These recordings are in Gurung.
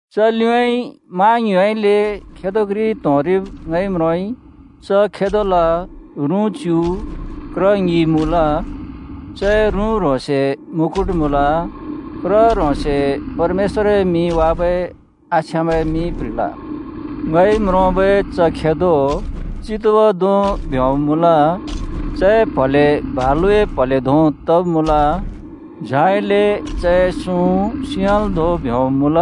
च लिउँइँ मा ङ्युँउँइँले खेदो घ्रि त्‍होंरिब् ङइ म्रोंइ। च खेदोल रुँ च्‍यु, क्र ङि मुँल। चए रुँ ह्रोंसे मुकुट मुँल, क्र ह्रोंसे परमेश्‍वरए मिं वाबै आछ्याँबै मिं प्‍ह्रिल। ङइ म्रोंबै च खेदो चितुवा धों ब्योंब् मुँल। चए प्‍हले भलुए प्‍हले धों तब् मुँल, झाइले चए सुँ सिंहल् धों ब्योंब् मुँल।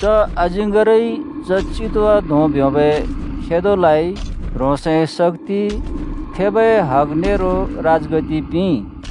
च अजिङ्गरइ च चितुवा धों ब्योंबै खेदोलाइ ह्रोंसए शक्‍ति, थेबै हग नेरो राजगद्दि पिंइ।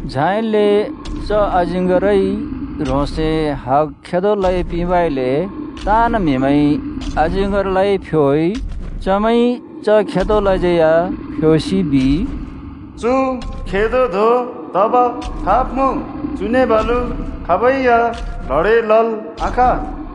झाइले च अजिङ्गरइ ह्रोंसए हग खेदोलाइ पिंबइले ताँन् म्‍हिमैंइ अजिङ्गरलाइ फ्‍योइ। चमैंइ च खेदोलाज्यै या फ्‍योसि बिइ, “चु खेदो धों तब खाब् मुँ? चुने बालु खाबै या ल्हडें लल् आखाँ।”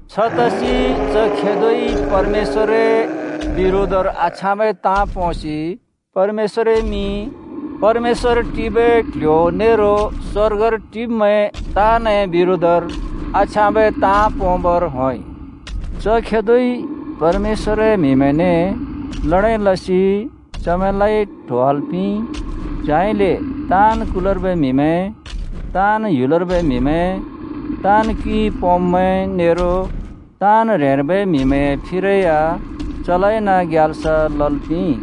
छतसि च खेदोइ परमेश्‍वरए बिरोधर आछ्याँबै ताँ पोंसि परमेश्‍वरए मिं, परमेश्‍वर टिबै क्‍ल्‍ह्‍यो नेरो स्‍वर्गर टिब्मैं ताँनए बिरोधर आछ्याँबै ताँ पोंबर होंइ। च खेदोइ परमेश्‍वरए म्‍हिमैंने ल्हडें लसि चमैंलाइ ट्होवाल् पिंइ। झाइले ताँन् कुलर्बै म्‍हिमैं, ताँन् ह्‍युलर्बै म्‍हिमैं, ताँन् क्युइ पोंब्‍मैं नेरो ताँन् ह्रेंर्बै म्‍हिमैंए फिरै या चलाइन ग्याल्स लल् पिंइ।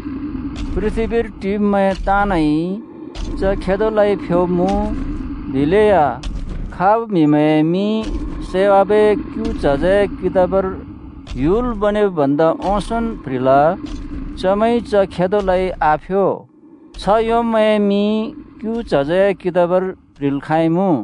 पृथ्‍बीर टिब्मैं ताँनइ च खेदोलाइ फ्‍योब्‍मुँ, दिलेया खाब् म्‍हिमैंए मिं सैवाबै क्‍यु च्हजए कितबर ह्‍युल बनेब् भन्दा ओंसोंन् प्ह्रिल, चमैंइ च खेदोलाइ आफ्यो। छ्ह योंब्‍मैंए मिं क्‍यु च्हजए कितबर प्‍ह्रिल् खाँइमुँ।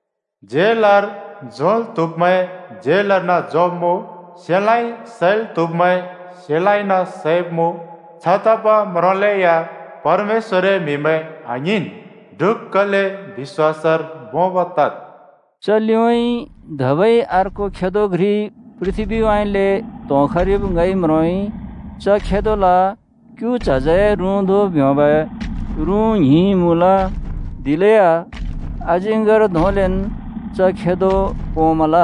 झेलर झोंल् त्हुब्मैं झेलर्न झोंब्मुँ। सेलाँइ सैल् त्हुब्मैं, सेलाँइन सैब्मुँ। छतब म्रोंलेया परमेश्‍वरए म्‍हिमैं आङ्हिंन्, ढुक्‍कले बिश्‍वासर भोंब् तद्।” च लिउँइँ धबै अर्को खदो घ्रि पृथ्‍बीउँइँले त्‍होंखरिब् ङइ म्रोंइ। च खेदोल क्यु च्हजए रुँ धों ब्योंबै रुँ ङ्हिं मुँल। दिलेया अजिङ्गर धोंलेन् च खेदो पोंमल।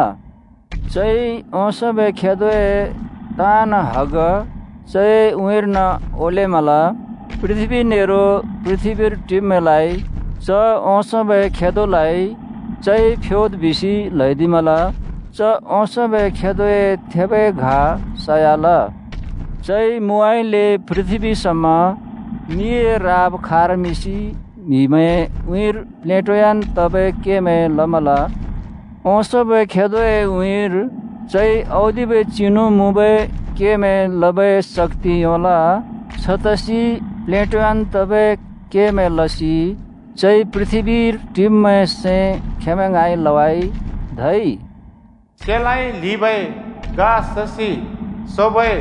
चइ ओंसोंबै खेदोए ताँन् हग चए उँइँर्न ओलेमल। पृथ्‍बी नेरो पृथ्‍बीर टिब्मैंलाइ च ओंसोंबै खेदोलाइ चइ फ्‍योद् बिसि ल्‍हैदिमल। च ओंसोंबै खेदोए थेबै घा सयाल। चइ मुउँइँले पृथ्‍बी समा मिए राब खारमिंसि म्हिमैंए उँइँर प्लेटोयान् तबै केमैं लमल। ओंसोंबै खेदोए उँइँर चइ औदिबै चिनु मुँबै केमैं लबै शक्ति योंल, छतसि प्लेटोयान् तबै केमैं लसि चइ पृथ्‍बीर टिब्मैंए सैं खेंमैं ङाँइ लवाइ। धै “सेलाँइ ल्हिबै घा ससि सोबै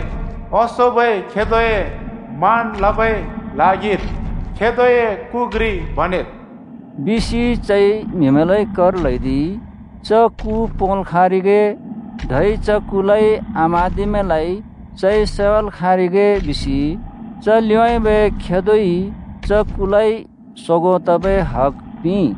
ओंसोंबै खेदोए मान लबै ल्हागिर खेदोए कु घ्रि बनेद्” बिसि चइ म्‍हिमैंलाइ कर ल्‍हैदिइ। च कु पोंल् खाँरिगे, धै च कुलाइ आम्हाँदिब्‍मैंलाइ चइ सैवाल् खाँरिगे बिसि च लिउँबै खेदोइ च कुलाइ सोगों तबै हग पिंइ।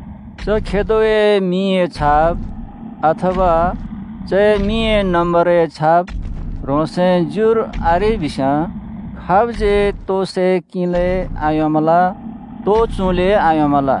च खेदोए मिंए छाप, अथवा चए मिंए नम्‍बरए छाप, ह्रोंसए ज्युर आरेइबिस्‍याँ खाबज्यै तोइ सै किंलै आयोंमल, तोइ चुँलै आयोंमल।